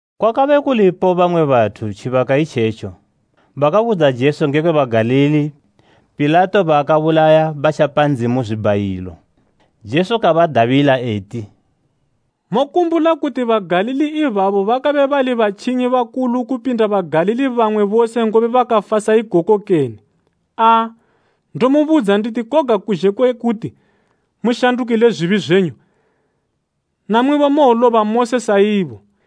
Kwakabe kulipo bamwe bathu tjibaka itjetjo, bakabudza Jesu ngekwe Bagalili Pilato baakabulaya batjapa Ndzimu zwibhayilo. Jesu kabadabila eti, “Mokumbula kuti Bagalili ibabo bakabe bali batjinyi bakulu kupinda Bagalili bamwe bose ngobe bakafa sa ikoko kene? Aa, ndomubudza nditi koga kuzhe kwe kuti mushandukile ku Ndzimu, namwibo mowoloba mose saibo.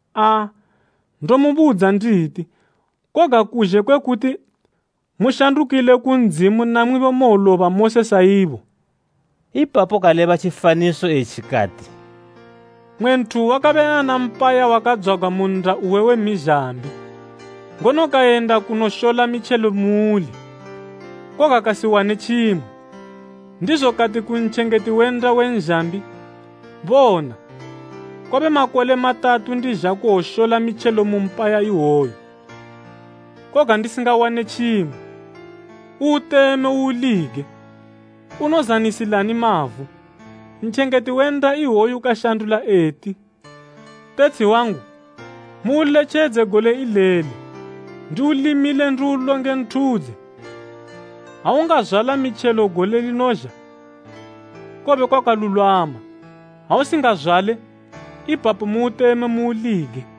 Aa, ndomubudza nditi koga kuzhe kwe kuti mushandukile ku Ndzimu namwibo mowoloba mose saibo.” Ipapo kaleba tjifaniso etji kati, “Mmwe nthu wakabe ana mpaya wakadzwagwa mu nnda uwe we mizhambi, ngono kayenda kunoshola mitjelo muuli, koga kasiwane tjimwe. Ndizo kati ku ntjengeti we nnda we nzhambi, ‘Bona, kwabe makole matatu ndizha kuwoshola mitjelo mu mpaya iwoyu, koga ndisingawane tjimwe. Uuteme uulige! Unozanisilani mavu?’ Ntjengeti we nnda iwoyo kashandula eti, ‘Tetshi wangu, muuletjedze gole ileli ndiulimile ndiulonge nthudze. Ha ungazwala mitjelo gole linozha, kowobe kwakalulwama! Ha usingazwale, ipapo muuteme muulige.’”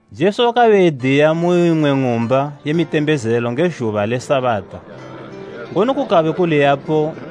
Jesu wakabe ediya mu imwe ng'umba ye mitembezelo nge zhuba le Sabata ngono kukabe kuliyapo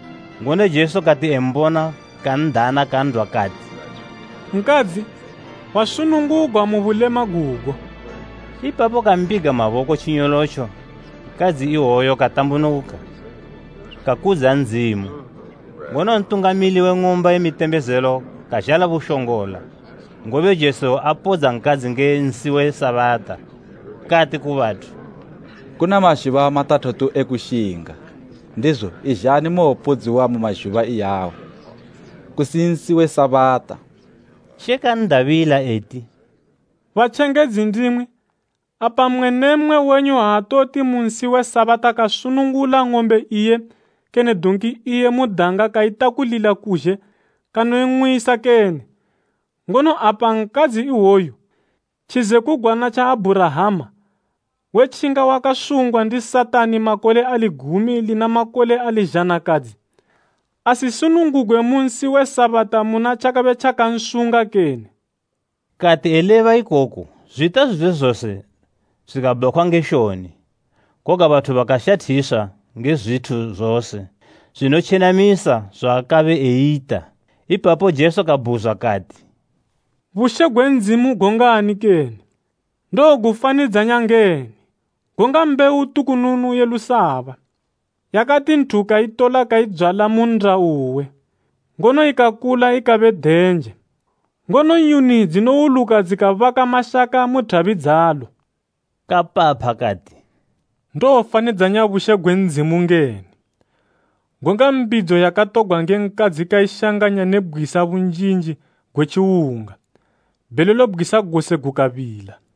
Ngono Jesu kati embona kan'dana kan'dwa kati, “Nkadzi, wasunungugwa mu bulema gugo.” Ipapo kambiga maboko tjinyolotjo nkadzi iwoyo katambunuka, kakudza Ndzimu. Ngono ntungamili we ng'umba ye mitembezelo kazhala bushongola, ngobe Jesu apodza nkadzi nge nsi we Sabata, kati ku bathu, “Kuna mazhuba matathatu e kushinga. Ndizo izhani muwopodziwa mu mazhuba iyawo, kusimu nsi we Sabata.” She kan'dabila eti, “Batjengedzi ndimwi! Apa mmwe ne mmwe wenyu aatoti mu nsi we Sabata kasunungula ng'ombe iye kene donki iye mu danga kaitakulila kuzhe kanoing'wisa kene? Ngono apa nkadzi iwoyu, tjizekugwana tja Abhurahama, wetjinga wakasungwa ndi Satani makole ali gumi lina makole ali zhanakadzi, asisunungugwe mu nsi we Sabata muna tjakabe tjakansunga kene?” Kati eleba ikoku zwita zwizwe zose zwikabhakhwa nge shoni, koga bathu bakashathiswa nge zwithu zose zwinotjenamisa zwaakabe eyita. Ipapo Jesu kabhuzwa kati, “Bushe gwe Ndzimu gongani kene? Ndowogufanidzanya ngeni? Gonga mbewu tukununu ye lusaba, yakati nthu kaitola kaidzwala mu nnda uwe. Ngono ikakula ikabe denje, ngono nyuni dzinowuluka dzikabaka mashaka mu thabi dzalo.” Kapapha kati, “Ndowofanidzanya bushe gwe Ndzimu ngeni? Gonga mbidzo yakatogwa nge nkadzi kaishanganya ne bgwisa bunjinji gwe tjiwunga, bhelelo bgwisa gose gukabila.”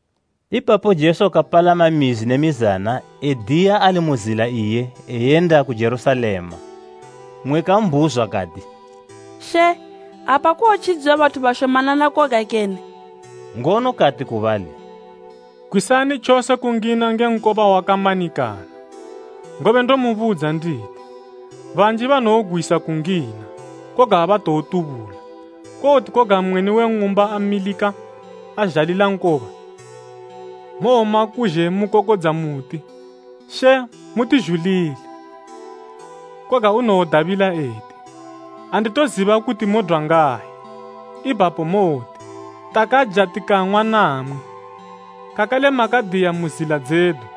Ipapo Jesu kapalama mizi ne mizana ediya ali mu zila iye eyenda ku Jerusalema. Mmwe kambhuzwa kati, “She, apa kowotjidziwa bathu bashomanana koga kene?” Ngono kati ku bali, “Gwisani tjose kungina nge nkoba wakamanikana, ngobe ndomubudza nditi, banji banowogwisa kungina, koga abatowotubula. Kowoti koga mweni we ng'umba amilika azhalila nkoba, mowoma kuzhe mukokodza muti, ‘She, mutizhulile,’ koga unowodabila eti, ‘Anditoziba kuti modwa ngayi.’ Ipapo mowoti, ‘Takaja tikang'wa namwi, kakale makadiya mu zila dzedu.’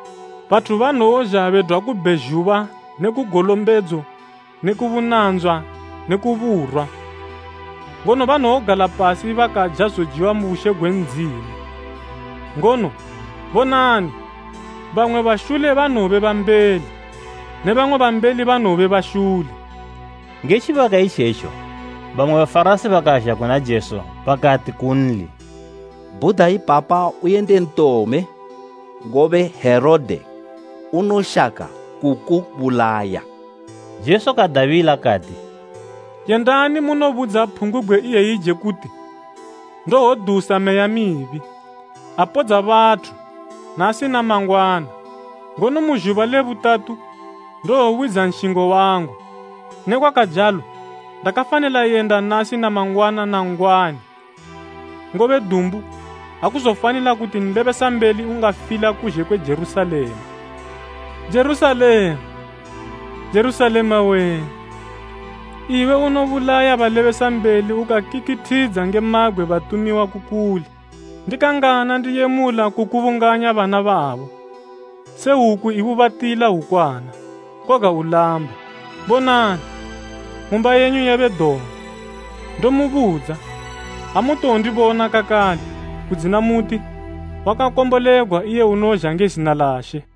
Bathu banowozha bedwa ku bhezhuba ne ku golombedzo ne ku bunandzwa ne ku burwa, ngono banowogala pasi bakaja zojiwa mu bushe gwe Ndzimu. Ngono bonani, bamwe bashule banowobe bambeli ne bamwe bambeli banowobe bashule.” Nge tjibaka itjetjo, bamwe Bafarasi bakazha kuna Jesu bakati kunli, “Bhuda ipapa uyende ntome ngobe Herode unoshaka kukubulaya.” Jesu kadabila kati, “Yendani munobudza phungubgwe iyeyije kuti, ‘Ndowodusa meya mibi, apodza bathu nasi na mangwana, ngono mu zhuba le butatu ndowowidza nshingo wangu.’ Nekwakajalo, ndakafanila yenda nasi na mangwana na nn'gwani, ngobe dumbu, akuzofanila kuti nlebesambeli ungafila kuzhe kwe Jerusalema. “Jerusalema! Jerusalema wee! Iwe unobulaya balebesambeli ukakikithidza nge mabgwe batumiwa ku kuli, ndikangana ndiyemula kukubunganya bana babo, se hwuku ibubatila hwukwana, koga ulamba? Bonani, ng'umba yenyu yabe dongo. Ndomubudza, amutowondibona kakale, kudzina muti, ‘Wakakombolegwa iye unozha nge zina la She!’”